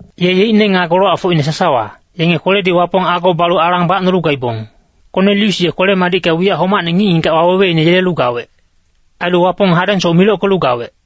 Ye yeicne nga golowacfocine sasawa, yenge kweledi Wapong ago balu alang bacnolu gaibong. Konelius ye kwele-madicka wiyac homacne ngic-ngigac waweweine yelelu gawec. Ailu Wapong hadengsoc milockelu gawec.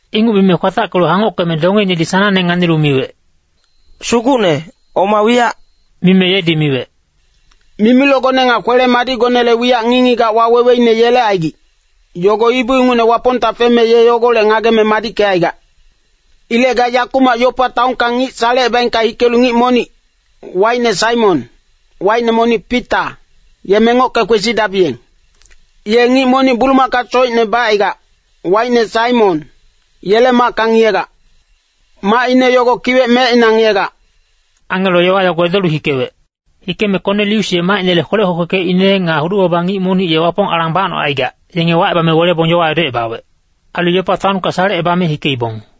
Inguc mime kwatackelu hangockeme dongeinedi sanangne nganilu miwec, “Sugucne, oma wiyac?” Mime yedi miwec, “Mimilocgone nga kwele-madicgonele wiyac ngic-ngigac waweweine yelecaigic, yogo ibu ingucne Wapongta feme ye yogolec ngageme madickecaigac. Ilec ga yakumac Yopa taonka ngic salecebang hikelu ngic monic, wacine Saimon, wacine monic Pita, ye mengocke kwesidabiyeng. Ye ngic monic bulumaka socine bacaigac, wacine Saimon, yele macka ngiyegac. Macine yogo kiwec mecina ngiyegac.” Angelo yowa yogo edolu hikewec. Hikeme Konelius ye macinele kwelec kwekwekecine nga hudu-baba ngic monic ye Wapong alang bacnocaigac, yenge wacebame welebong yowa edocebawec. Ailu Yopa taonka salecebame hikeibong.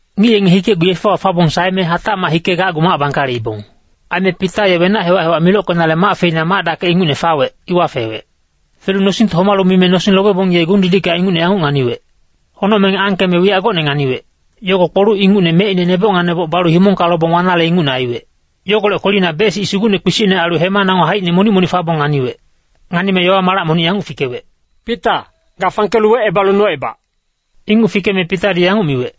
Ngic yenge hikecgu yefewa fabong saeme hatacmac hikegacgu mac bangkaleibong. Aime Pita ye wenac hewac-hewac milockenale mac feina mac-dakec ingucne fawec, iwa fewec. Felu nosingte homalu mime nosing lobebong ye gung-didicka ingucne yanguc nganiwec. Honocmeng angkeme wiyac gocne nganiwec. Yogo kpoluc ingucne mecine neboc nga neboc balu himongka lobong wanale ingucne aiwec. Yogolec kwelina bec-sic sugucne kpisicne ailu hema nango haicine monic-monic fabong nganiwec. Nganime yowa malac monic yanguc fikewec, “Pita, ga fangkelu wecebalu nocebac.” Inguc fikeme Pitadi yanguc miwec,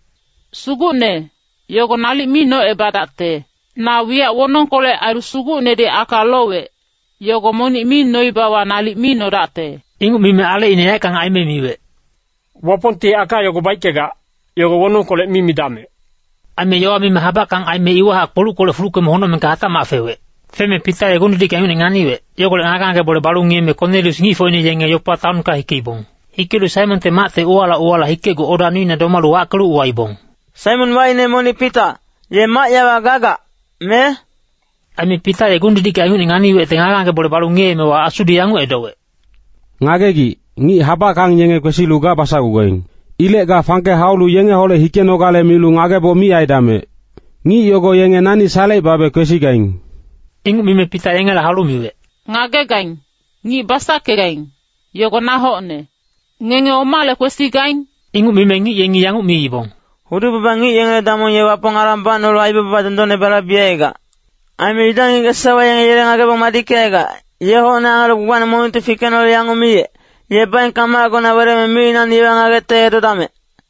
“Sugucne, yogo nalic mi nocebadacte! Na wiyac wonongkolec ailu Sugucnedi aka lowec, yogo monic mi noibawa nalic mi nodacte.” Inguc mime alecine yaeckang aime miwec, “Wapongti aka yogo baickegac, yogo wonongkolec mi midamec.” Aime yowa mime habackang aime iwahac kpoluckolec fuluckeme honocmengka hatacmac fewec. Feme Pita ye gung-didicka ingucne nganiwec, yogolec ngage-ngage bole balu ngiyeme Konelius ngicfocine yenge Yopa taonka hikeibong. Hikelu Saimonte macte uwala uwala hikecgu oda nuina domalu wackelu uwaibong, “Saimon wacine monic Pita, ye mac yawa gagac, me?” Aime Pita ye gung-didicka ingucne nganiwecte ngage-ngage bole balu gaemewa Asudi yanguc edowec, “Ngagegic, ngic habackang yenge kwesilu ga basacgugaing. Ilec ga fangke haulu yengeholec hikenogale milu ngageboc mi aidamec. Ngic yogo yenge nani salecebabe kwesigaing.” Inguc mime Pita yengela haulu miwec, “Ngagegaing, ngic basackegaing, yogo na hocne. Ngenge omale kwesigaing?” Inguc mime ngic yengi yanguc miibong, “Hudu-baba ngic yengele damong ye Wapong alang bacnolu aibaba dondonne balaibecaigac. Aime Yuda ngic-ngigac sasawa yenge yele ngagebong madickecaigac, ye hocne angelo gbagbacne monicti fikecnolu yanguc miyec, ‘Ye baengka macgona weleme micinacni yowa ngagecte edodamec.’”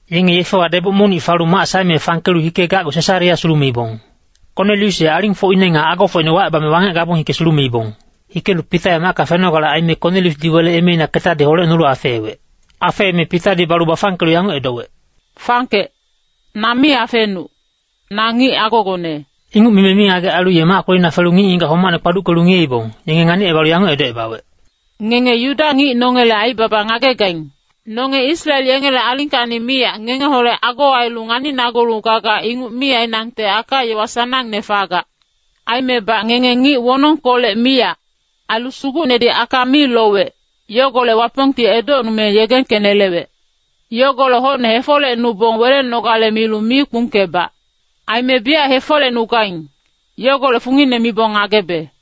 Yenge yefewa deboc monic falu mac saeme fangkelu hikegacgu Sesarea sulumeibong. Konelius ye alingfocine nga agofocine wacebame wangec gabong hike sulumeibong. Hikelu Pita ye macka fenogale aime Koneliusdi wele emeina ketadi holecnolu afeewec. Afeeme Pitadi balu bafangkelu yanguc edowec, “Fangkec, na mi afenuc, na ngic agogone.” Inguc mime mingagec ailu ye mac kwelina felu ngic-ngigac homacne kpaduckelu ngiyeibong, yenge nganicebalu yanguc edocebawec, “Ngenge Yuda ngic nongele aibaba ngagegaing. Nonge Israel yengele alingkacni miyac ngengeholec ago ailu nganinagulu gaga inguc mi ainangte aka-yowa sanangne fagac. Aimebac ngenge ngic wonongkolec miyac, ailu Sugucnedi aka mi lowec, yogolec Wapongti edocnume yegengkenelewec. Yogolec hocne hefolecnubong welenogale milu mi kpungkebac. Aime biyac hefolecnugaing, yogolec fungine mibong ngagebe.”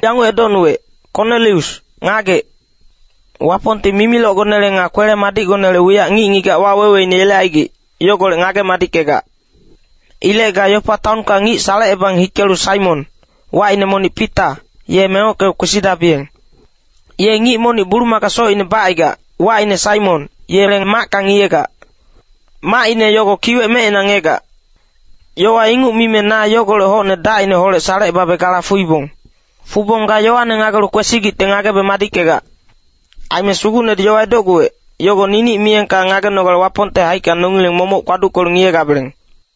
yanguc edocnuwec, ‘Konelius, ngagec. Wapongti mimilocgonele nga kwele-madicgonele wiyac ngic-ngigac waweweine yelecaigic, yogolec ngage-madickegac. Ilec ga Yopa taonka ngic salecebang hikelu Saimon, wacine monic Pita, ye mengocke kwesidabiyeng. Ye ngic monic bulumaka socine bacaigac, wacine Saimon, yele macka ngiyegac. Macine yogo kiwec mecina ngiyegac.’ Yowa inguc mime na yogolec hocne dacineholec salecebabe gala fuibong. Fubong ga yowane ngagelu kwesigicte ngagebe madickegac. Aime Sugucnedi yowa edocguwec, yogo ninic miyengka ngagenogale Wapongte haicka nongileng momoc kpaduckelu ngiyegabeleng.”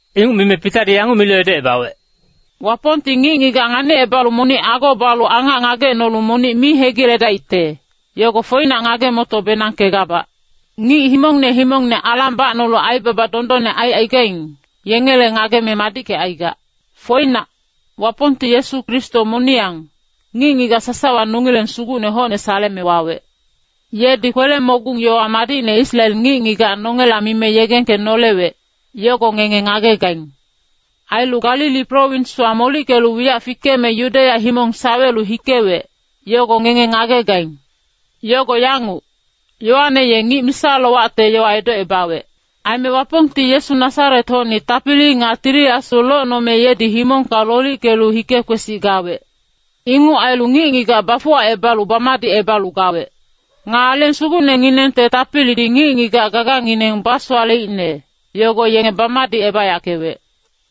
Inguc mime Pitadi yanguc milu edocebawec, “Wapongti ngic-ngigac nganicebalu monic ago balu angac ngagecnolu monic mi hegiledaicte, yogo foinac ngage-moto-benangkegabac. Ngic himongne himongne alang bacnolu aibaba dondonne aicaigaing, yengele ngageme madickecaigac. Foinac, Wapongti Yesu Kristo moniyang, ngic-ngigac sasawa nongileng Sugucne hocne saleme wawec. Yedi kwele-mogung yowa madicne Israel ngic-ngigac nongela mime yegengkenolewec, yogo ngenge ngagegaing. Ailu Galili prowinswa molickelu wiyac fikeme Yudeya himong sawelu hikewec, yogo ngenge ngagegaing. Yogo yanguc, Yoane ye ngic misa-lowacte yowa edocebawec. Aime Wapongti Yesu Nasaret-hocni tapili nga Tili Asu locnome yedi himongka lolickelu hike-kwesic gawec. Inguc ailu ngic-ngigac bafuwacebalu bamadicebalu gawec. Nga Aleng Sugucnenginengte tapilidi ngic-ngigac gagangineng basowaleicne, yogo yenge bamadicebayackewec.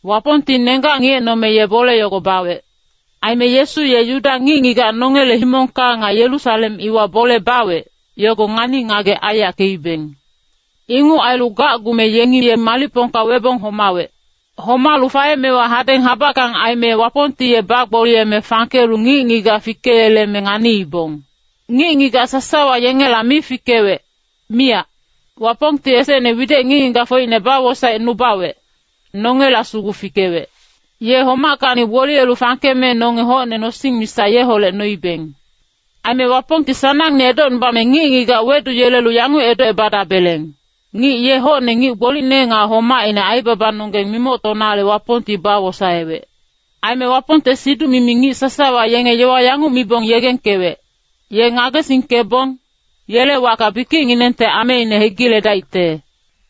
Wapongti nenggac ngiyecnome ye bole yogo bawec. “Aime Yesu ye Yuda ngic-ngigac nongele himongka nga Yerusalem iwa bole bawec, yogo ngani-ngagec aiyackeibeng. Inguc ailu gacgume yengi ye malicpongka webong homawec. Homalu faemewa hadeng habackang aime Wapongti ye bagboliyeme fangkelu ngic-ngigac fikeyeleme nganiibong. Ngic-ngigac sasawa yengela mi fikewec, miyac. Wapongti esecne widec ngic-ngigacfocine bawosaecnubawec, nongela sugu fikewec. Ye homackacni gboliyelu fangkeme nonge hocne nosing misa yeholec noibeng. Aime Wapongti sanangne edocnubame ngic-ngigac weduyelelu yanguc edocebadabeleng, ‘Ngic ye hocne ngic gbolicne nga homaicne aibabanonggeng mimoctonale Wapongti bawosaewec.’ Aime Wapongte siduc-mimi ngic sasawa yenge yowa yanguc mibong yegengkewec, ‘Ye ngagesingkebong, yele wacka bikicnginengte ameine hegiledaicte.’”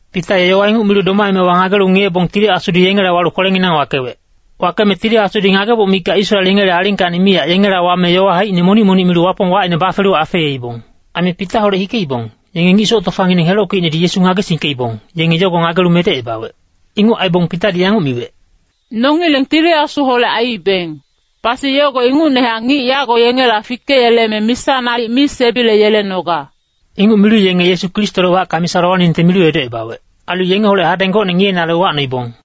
Pita ye yowa inguc milu domaemewa ngagelu ngiyebong Tili Asudi yengela walu kwelenginang wakewec. Wakeme Tili Asudi ngageboc mikac Israel yengele alingkacni miyac yengela wame yowa haicine monic-monic milu Wapong wacine bafelu afeeibong. Aime Pitaholec hikeibong, yenge ngic soc tofangineng helockeicnedi Yesu ngagesingkeibong, yenge yogo ngagelu medecebawec. Inguc aibong Pitadi yanguc miwec, “Nongileng Tili Asuholec aiibeng, pasi yogo ingucnehac ngic yago yengela fikeyeleme misa nalic mi sebileyelenoga.” Inguc milu yenge Yesu Kristole wacka misa lowaningte milu edocebawec. Ailu yengeholec hadeng gocne ngiyenale uwacnoibong.